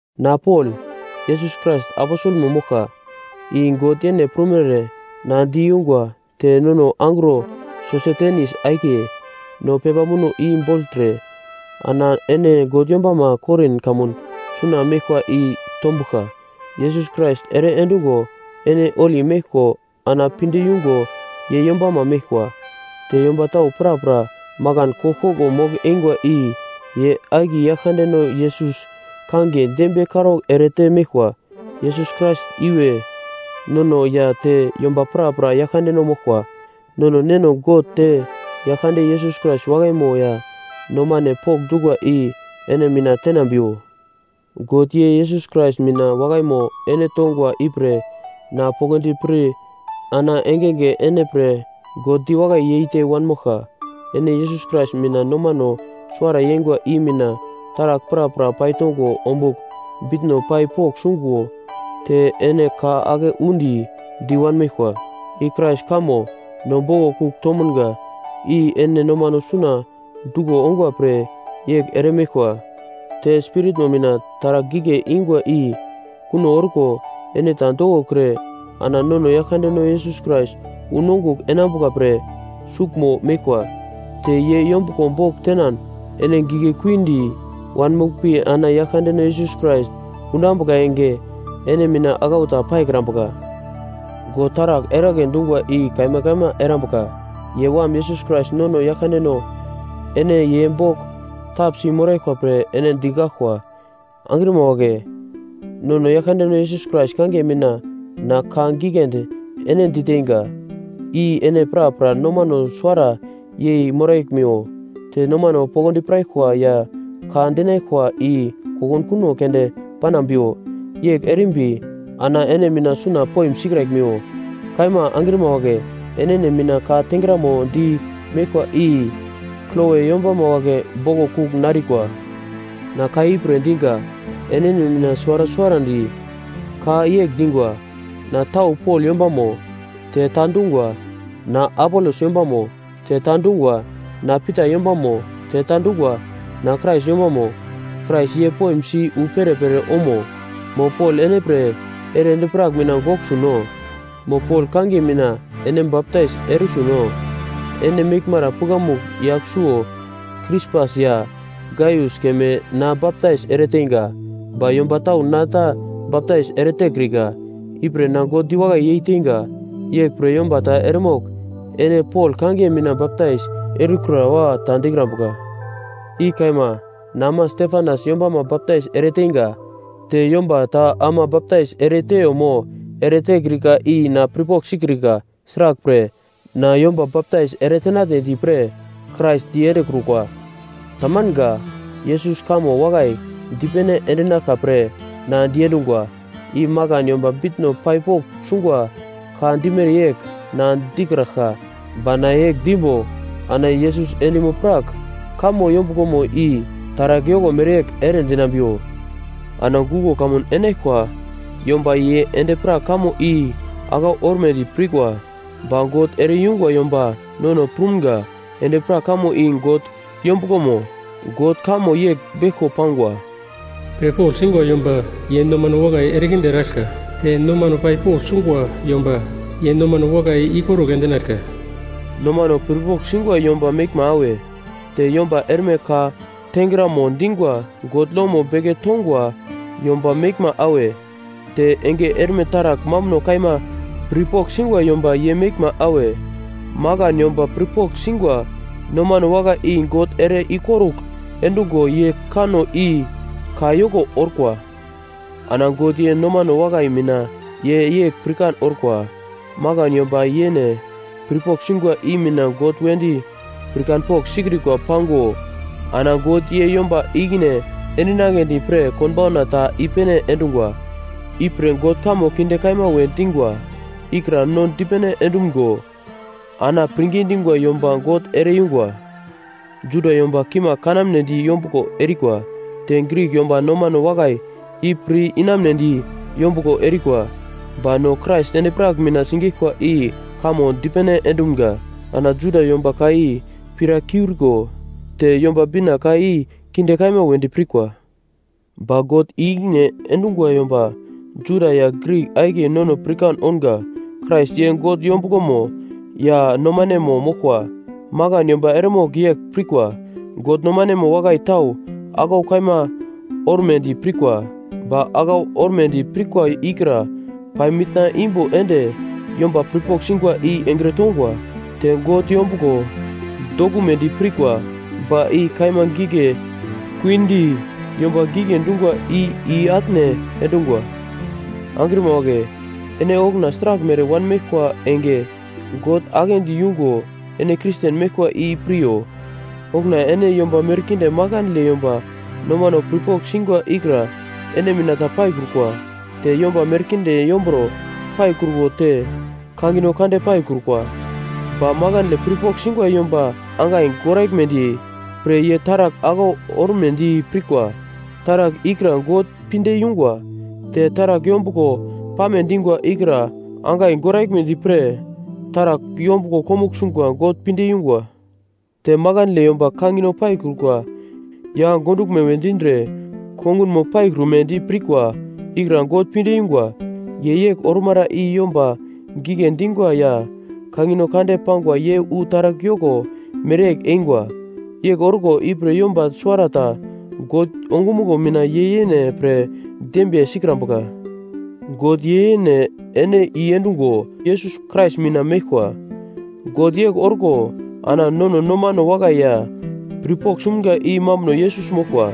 Na Pol, Yesus Krais aposelmo moglka, i God yene prumere na di yungwa te nono angro Sosetenis akiye, no pepa muno i bogltre ana ene God yombama Korin kamun suna meglkwa i tombuglka. Yesus Krais ere endungo ene holi meglko ana pinde yungo ye yombama meglkwa. Te yomba tau prapra makan koglkoglo mogl-eingwa i ye akiye Yaglkandeno Yesus kangiye dembiye karaugl erete meglkwa. Yesus Krais iwe, nono ya te yomba prapra Yaglkandeno moglkwa. Nono Neno God te Yaglkande Yesus Krais wakaimo ya nomane pokndungwa i ene mina tenambiwo. God ye Yesus Krais mina wakaimo ene tongwa ipre na poglodi pir ana engenge ene pre God diwakai yeite wanmoglka. Ene Yesus Krais mina nomano suwara yeingwa i mina taragl prapra paitongo ombugl bitno pai pogl sungo te ene ka ake undi di wanmeglkwa. I Krais kamo no boglo kugl tomunga i ene nomano suna duglo ongwa pre yegl eremeglkwa. Te Spiritmo mina taragl gigle ingwa i kuno orko ene ta dokokre ana nono Yaglkandeno Yesus Krais unongugl enambuka pre suglmo meglkwa. Te ye yombuglo bogl tenan ene gigle kuindi wanmoglpi ana Yaglkandeno Yesus Krais unambuka enge, ene mina aglau ta paikrambuka. God taragl eragle dungwa i kaima kaima erambuka. Ye Wam Yesus Krais nono Yaglkandeno, ene ye bogl tapsi moraglkwa pre ene digaglkwa. Angrima wagle, nono Yaglkandeno Yesus Krais kangiye mina na ka giglendi ene diteinga, i ene prapra nomano suwara yei moraglmiwo, te nomano poglodi piraglkwa ya ka dinaglkwa i kokunkuno keunde panambiwo. Yegl erimbi ana ene mina suna poim sikraglimiwo. Kaima angrima wagle, enene mina ka tengramo di meglkwa i Kloe yombama wagle boglo kugl narikwa. Na ka ipre diga, enene mina suwara suwarandi ka yegl dingwa, “Na tau Pol yombamo.” Te ta dungwa, “Na Apolos yombamo.” Te ta dungwa, “Na Pita yombamo.” Te ta dungwa, “Na Krais yombamo.” Krais ye poimsi wu perepere omo? Mo Pol ene pre ere endi-prak mina gogl suno? Mo Pol kangiye mina ene baptais ere suno? Ene meglmara pukamugl yagl suwo Krispas ya Gaius keme na baptais ereteinga, ba yomba tau na ta baptais eretekrika. Ipre na God diwakai yeiteinga. Yeglpre yomba ta eremogl ene Pol kangiye mina baptais erikura wa ta dikrambuka. I kaima, na ama Stefanas yombama baptais ereteinga. Te yomba ta ama baptais ereteiyo mo eretekrika i na pirpogl sikrika. Sraglpre, na yomba baptais eretenatnedi pre Krais diendekrukwa. Tamanga. Yesus kamo wakai dipene endinaglka pre na diendungwa. I makan yomba bitno pai pogl sungwa ka dimere yegl na dikraglka, ba na yegl dimbo ana Yesus endimo-prak kamo yombuglomo i taragl yoko mereyegl ere dinambiwo. Ana guglo kamun enaglkwa yomba ye endi-prak kamo i aglau ormedi pirkwa. Ba God ere-yungwa yomba nono prumga endi-prak kamo i God yombuglomo. God kamo yegl beglko pangwa: “Pirpogl singwa yomba ye nomano wakai erekinde eraglka, te nomano pai pogl sungwa yomba ye nomano wakai ikorugl endinaglka.” Nomano pirpogl singwa yomba meglma awe? Te yomba erme ka tengramo dingwa God lomo beke tongwa yomba meglma awe? Te enge erme taragl mambuno kaima pirpogl singwa yomba ye meglma awe? Makan yomba pirpogl singwa nomano wakai i God ere ikorugl endungo ye kanno i ka yoko orkwa. Ana God ye nomano wakai mina ye yegl pirkan orkwa, makan yomba yene pirpogl singwa i mina God wedi pirkanpogl sikrikwa pango, ana God ye yomba ikine endinagledi pre konbauna ta i-pene endungwa. Ipre God kamo kinde kaima we dingwa ikra no dipene endumgo ana pirngi dingwa yomba God ere-yungwa. Juda yomba kimagl kanamnedi yombuglo erikwa, te Grik yomba nomano wakai i pir inamunedi yombuglo erikwa, ba no Krais endi-prak mina sigeglkwa i kamo dipene endumga. Ana Juda yomba ka i pirakuriko te Yomba Bina ka i kinde kaima wedi pirkwa. Ba God i-ikine endungwa yomba, Juda ya Grik akiye nono pirkan ounga Krais ye God yombuglomo ya nomanemo moglkwa. Makan yomba eremogl yegl pirkwa: God nomanemo wakai tau aglau kaima ormedi pirkwa, ba aglau ormedi pirkwa ikra pai mitna imbo ende yomba pirpogl singwa i engre tongwa. Te God yombuglo dokumedi pirkwa, ba i kaima gigle kuindi yomba gigle dingwa i i-atne endungwa. Angrima wagle, ene okuna sraglmere wanmeglkwa enge, God aglendi yungo ene Kristen meglkwa i piryo. Okuna ene yomba merkinde makandle yomba nomano pirpogl singwa ikra ene mina ta paikrukwa. Te yomba merkinde yomburo paikruko te kangino kande paikrukwa. Ba makandle pirpogl singwa yomba angai goraglmedi pre ye taragl aglau ormedi pirkwa taragl ikra God pinde yungwa. Te taragl yombuglo pame dingwa ikra angai goraglmedi pre taragl yombuglo komugl sungwa God pinde yungwa. Te makandle yomba kangino paikrukwa ya gonduglme we dindre kongunmo paikrumedi pirkwa ikra God pinde yungwa. Ye yegl ormara i yomba gigle dingwa ya kangino kande pangwa ye wu taragl yoko mereyegl eingwa. Yegl orkwa ipre yomba suwarata God ongumuglo mina ye yene pre dembiye sikrambuka. God ye yene ene i-endungo Yesus Krais mina meglkwa. God yegl orko ana nono nomano wakai ya pirpogl sumga i mambuno Yesus moglkwa.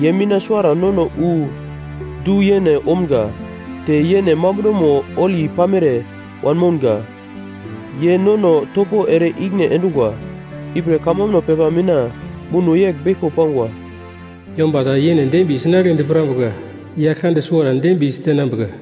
Ye mina suwara nono wu du-yene omga, te yene mambunomo holi pamere wanmounga. Ye nono topo ere ikine endungwa. Ipre kamambuno pepa mina muno yegl beglko pangwa: “Yomba ta yene dembiye sinagledi pirambuka, Yaglkande suwara dembiye si tenambuka.”